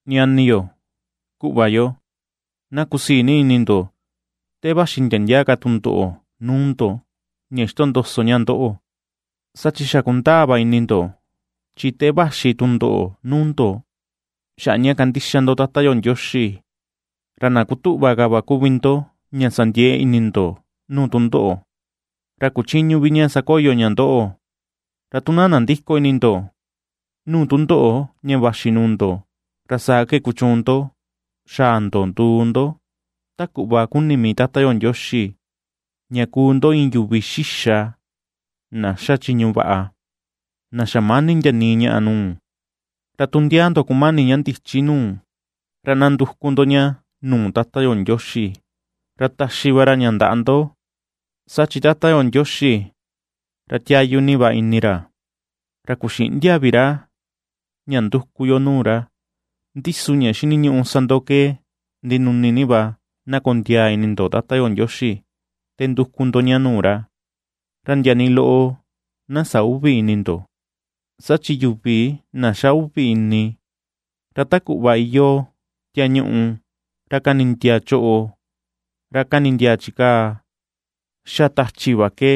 Ñani yo, kuꞌva yo, na kusii ni ini ndo, te vaxi ndia ndia ka tundoꞌo nuu ndo, ña xitondoso ña ndoꞌo. Saa chi xa kundaa va ini ndo, chi te vaxi tundoꞌo nuu ndo xaꞌa ña kandixa ndo Tata yo Ndioxi, ra na kutuꞌva ka va kuvi ndo, ña sa ndiee ini ndo nuu tundoꞌo, ra kuchïñu vi ña sakoyo ña ndoꞌo. Ra tu na nandïko ini ndo nuu tundoꞌo ña vaxi nuu ndo, ra saa ke kuchuun ndo xaa ndo nduu ndo ta kuꞌva kuni mii Tata yo Ndioxi, ña kuu ndo iin yuvi xixa, na xa chiñu vaꞌa, na xamäni ndia nii ñaꞌa nuu. Ra tu ndia ndo kumani ña ndichi nuu, ra na nduku ndo ña nuu Tata yo Ndioxi, ra taxi va ra ña ndaꞌa ndo; saa chi Tata yo Ndioxi ra tiayu ni va ini ra, ra ^kuxïꞌndia vi ra ña nduku yo nuu ra. Ndi su ña xiniñuꞌu sa ndo ke ndinuni ni va na kondiaa ini ndo Tata yo Ndioxi te nduku ndo ña nuu ra, ra ndia nii loꞌo na sä uvi ini ndo; saa chi yuvi na xa uvi ini, ra ta kuꞌva iyoo tiaa ñuꞌu, ra kanindiaa choꞌo, ra kanindiaa chikaa xa tachi va ke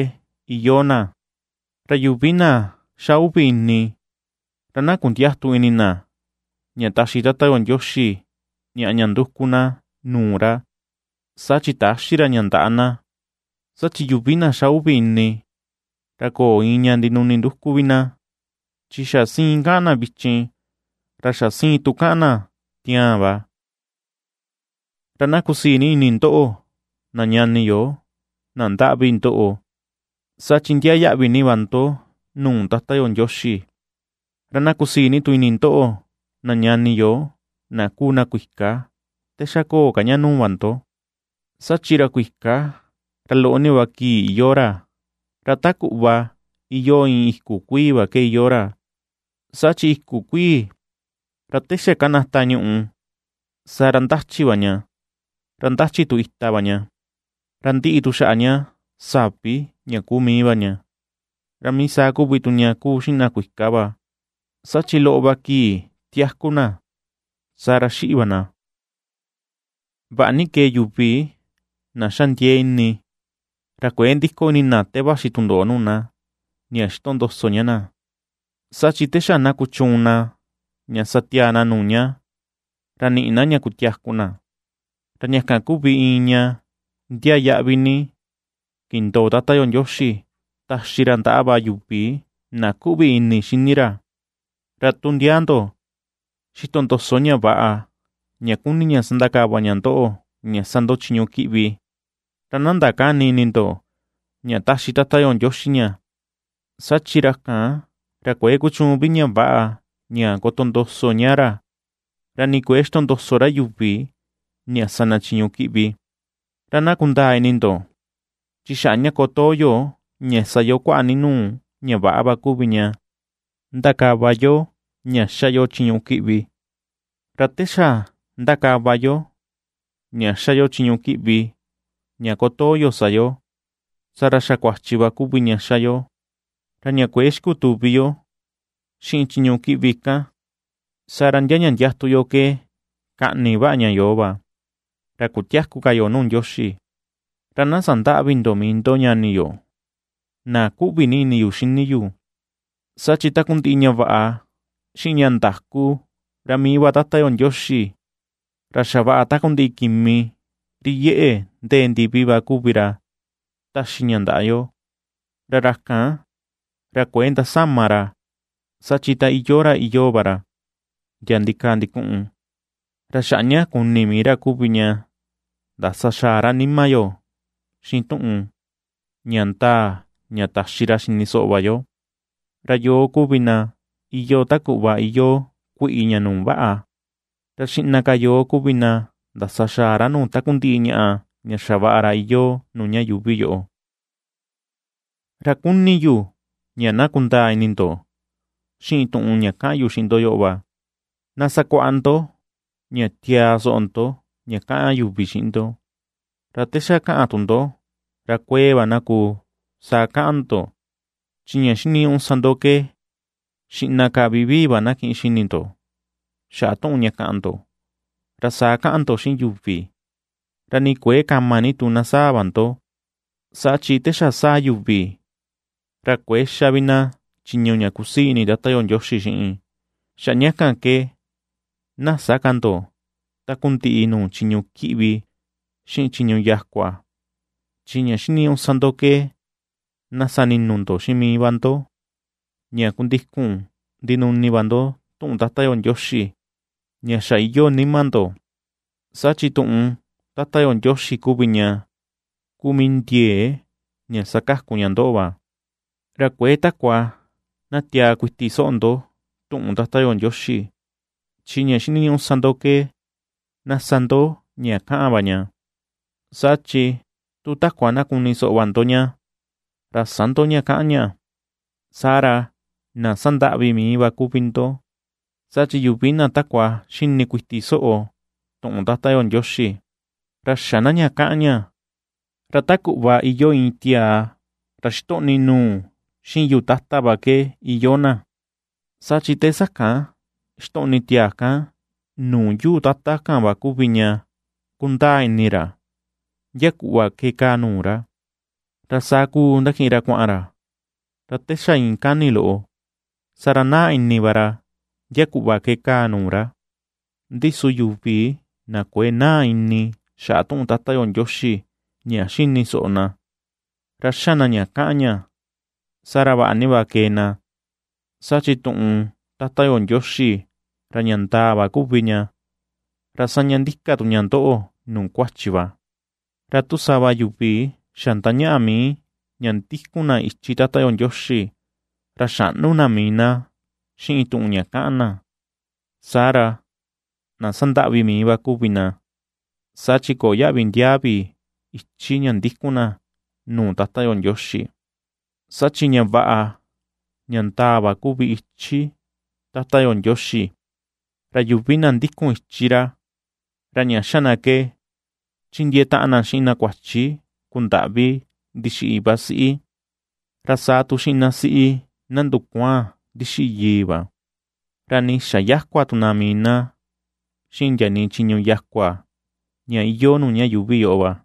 iyoo na kan. Ra yuvi na xa uvi ini, ra na kundiätu ini na ña taxi Tata yo Ndioxi ñaꞌa ña nduku na nuu ra, saa chi täxi ra ña ndaꞌa na, saa chi yuvi na xa uvi ini, ra köo iin ña ndinuni nduku vi na, chi xa siin kaꞌan na vichin, ra xa siin tu kaꞌan na tiaan va. Ra na kusii ni ini ndoꞌo na ñani yo na ndaꞌvi ndoꞌo, saa chi ndiaa yaꞌvi ni va ndo nuu Tata yo Ndioxi; ra na kusii tu ini ndoꞌo na ñani yo na kuu na kuika te xa köo ka ña nuu va ndo; saa chi ra kuika ra loꞌo ni va kii iyoo ra; ra ta kuꞌva iyoo iin iku kuii va ke iyoo ra: saa chi iku kuii, ra te xa kanata ñuꞌu, saa ra ndachi va ña; ra ndachi tu ita va ña, ra ndiꞌi tu xaꞌa ña savi kuu mii va ña. Ra mii saa kuvi tu ña kuu xiꞌin na kuika va, saa chi loꞌo va kii tiaku na, saa ra xiꞌi va na. Vaꞌa ni kee yuvi na xa ndiee ini, ra kuëe ndiko ini na te vaxi tundoꞌo nuu na, ña xitondoso ña na, saa chi te xa na kuchuun na ña sa tiaa na nuu ña, ra niꞌi na ña kutiaku na, ra ña kan kuvi iin ñaꞌa ña ndiaa yaꞌvi ni kindoo Tata yo Ndioxi taxi ra ndaꞌa va yuvi na kuꞌvi ini xini ra. Ra tu ndia ndo xitondoso ña väꞌa ña kuni ña sandakava ña ndoꞌo ña sa ndo chiñu kiꞌvi, ra na ndakäni ini ndo, ña taxi Tata yo Ndioxi ña; saa chi ra kan, ra kuëe kuchuun vi ña väꞌa ña kotondoso ña ra, ra nii kuëe xitondoso ra yuvi ña sa na chiñu kiꞌvi. Ra na kundaa ini ndo, chi ña xaꞌa ña kotoo yo ña sa yo kuaꞌa ni nuu ña väꞌa va kuvi ña, ndakava yo ña ^xa yo chiñu kiꞌvi. Ra te xa ndakava yo ña ^xa yo chiñu kiꞌvi ña kotoo yo sa yo, saa ra xa kuachi va kuvi ña ^xa yo, ra ña kuëe xikutuvi yo xiꞌin chiñu kiꞌvi kan, saa ra ndia ña ndiatu yo ke kaꞌni vaꞌa ña yo va, ra kutiäku ka yo nuu Ndioxi. Ra na sandäꞌvi ndo mii ndo, ñani yo, na ^kuꞌvi ni ini yu xini yu; saa chi takundiꞌi ña vaꞌa, xiꞌin ña ndaku, ra mii va Tata yo Ndioxi, ra xavaꞌa takundiꞌi kimi ri iyeꞌe ndee ndivi va kuvi ra taxi ña ndaꞌa yo. Ra ra kan, ra kuëe ndasama ra saa chi ta iyoo ra iyoo va ra ndia ndikaa ndikuꞌun. Ra xaꞌa ña kuni mii ra kuvi tu ña ndasa xaa ra nima yo xiꞌin tuꞌun, ña ndaa ña taxi ra xini soꞌo va yo, ra yoo kuvi na iyoo ta kuꞌva iyoo kuiꞌi ña nuu vaꞌa, ra xiꞌna ka yoo kuvi na ndasaxaa ra nuu takundiꞌi ñaꞌa ña xavaꞌa ra iyoo nuu ña yuuvi yoꞌo. Ra kuni tu yu ña na kundaa ini ndo xiꞌin tuꞌun ña kaꞌan yu xiꞌin ndo yoꞌo va; na sakuaꞌa ndo ña tiaa soꞌo ndo ña kaꞌan yuvi xiꞌin ndo, ra te xa kaꞌan tu ndo, ra kuee va na kuu, saa kaꞌan ndo, chi ña xiniñuꞌu sa ndo ke xiꞌna ka vivii va na kiꞌin xini ndo xaꞌa tuꞌun ña kaꞌan ndo, ra saa kaꞌan ndo xiꞌin yuvi; ra nii kuëe kama ni tu na sáa̱ va ndo. Saa chi te xa sáa̱ yuvi, ra kuëe xa vi na chiñu ña kusii ini Tata yo Ndioxi xiꞌin. Xaꞌa ña kan ke na sä ka ndo takundiꞌi nuu chiñu kiꞌvi, xiꞌin chiñu yakua, chi ña xiniñuꞌu sa ndo ke na sa ninu ndo xiꞌin mii va ndo, ña kundikun ndinuni va ndo tuꞌun Tata yo Ndioxi ña xa iyoo nima ndo, saa chi tuꞌun Tata yo Ndioxi kuvi ña kuu mii ndiee ña sakaku ña ndoꞌo va. Ra kuëe takua na tiaa kuiti soꞌo ndo tuꞌun Tata yo Ndioxi, chi ña xiniñuꞌu ke na sa ndo ña kaꞌan va ña. Saa chi tu takua na kuni soꞌo va ndo ña, ra sä ndo ña kaꞌan ña, saa ra na sandaꞌvi mii va kuvi ndo. Saa chi yuvi na takua xini kuiti soꞌo tuꞌun Tata yo Ndioxi, ra xä na ña kaꞌan ña, ra ta kuꞌva iyoo iin tiaa ra xitoꞌni nuu xiꞌin yuu tata va ke iyoo na. Saa chi te sakan xitoꞌni tiaa kan nuu yuu tata kan va kuvi ña kundaa ini na ra ndia kuꞌva ke kaa nuu ra, ra saa kuu ndakiꞌin ra kuaꞌan ra, ra te xa iin kani loꞌo, saa ra naa ini va ra ndia kuꞌva ke kaa nuu ra. Ndi su yuvi na kuëe naa ini xaꞌa tuꞌun Tata yo Ndioxi ña xini soꞌo na, ra xa na ña kaꞌan ña, saa ra vaꞌa ni va kee na. Saa chi tuꞌun Tata yo Ndioxi, ra ña ndaa va kuvi ña, ra saña ndika tu ña ndoꞌo nuu kuachi va. Ra tu sava yuvi xa ndañaꞌa mii ña ndikun na ichi Tata yo Ndioxi, ra xäꞌnu na mii na xiꞌin tuꞌun ña kaꞌan na, saa ra na sandaꞌvi mii va kuvi na, saa chi köo yaꞌvi ndiaa vi ichi ña ndikun na nuu Tata yo Ndioxi. Saa chi ña vaꞌa, ña ndaa va kuvi ichi Tata yo Ndioxi, ra yuvi na ndikun ichi ra, ra ña xa na ke: chindiee taꞌan na xiꞌin na kuachi kundaꞌvi ndixiꞌi iva siꞌi, ra saa tu xiꞌin na siꞌi na ndukuaan ndixiꞌi yii va, ra nii ^xa yäkua tu na mii na xiꞌin ndia nii chiñu yakua ña iyoo nuu ña yuuvi yoꞌo va.